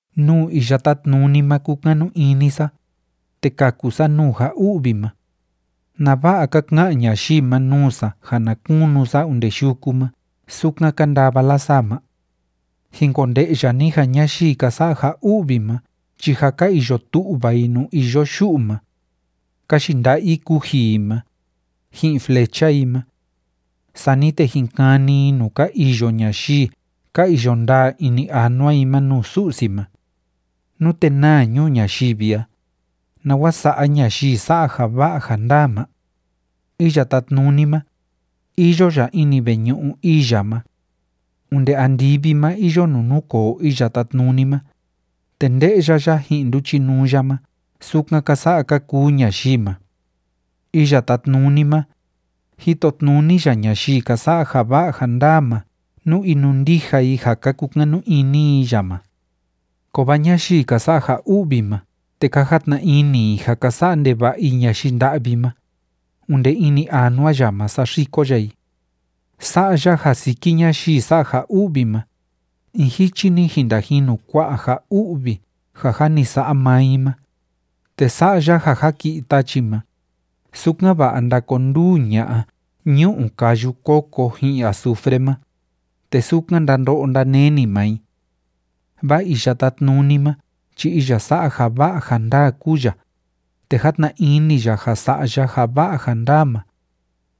Nuu Iya Tátnuni ma kúkanu ini sa, te kaku sa nuu ja u'vi ma. ¿Nava'a ka ka'an ñayii ma nuu sa ja na kunu sa onde yuku ma sukan ka ndava lasaa ma? Jin konde'ya ni ja ñayii ka sa'a ja u'vi ma chi jâ ka iyo tu'va i nuu iyo yu'u ma. Ka yinda'a i kuji i ma, ji'in flecha i ma. Sani te jin kani i nuu ka iyo ñayii ka iyo ndaa ini anua i ma nuu Su'si ma. Nute naa ñuu ñayivi a, ¿nawa sa'a ñayii sa'a ja va'a ja ndaa ma? Iya Tátnuni ma, iyo ya ini veñu'u ii ya ma. Onde andivi ma iyo nuu núkoo Iya Tátnuni ma, te nde'ya ya ji'in nduchinuu ya ma sukan ka sa'a ka kuu ñayii ma. Iya Tátnuni ma, jitotnuni ya ñayii ka sa'a ja va'a ja ndaa ma nú inundija i ja ka kukanu ini i ya ma. Kovaa ñayii ka sa'a ja u'vi ma te ka jatna ini i ja ka sa'a ndeva'a i ñayii nda'vi ma, onde ini anua ya ma saxiko ya i. Sa'a ya ja siki ñayii sa'a ja u'vi ma, in jichi‑ni jin ndajinu kua'a ja u'vi ja jâ ni sa'a maa i ma, te sa'a ya ja jaki'i tachi ma, sukan‑va'a ndakonduu ña'a ñu'u káyu kóko ji'in azufre ma, te sukan ndando'o ndaneni maa i. Vaa Iya Tátnuni ma chi iya sa'a ja va'a ja ndaa kúu ya, te játna ini ya ja sa'a ya ja va'a ja ndaa ma.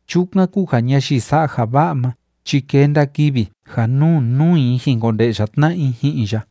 Chukan kúu ja ñayii sa'a ja va'a ma chi kenda kivi ja nuu nuu i jin konde'ya tna'a i ji'in ya.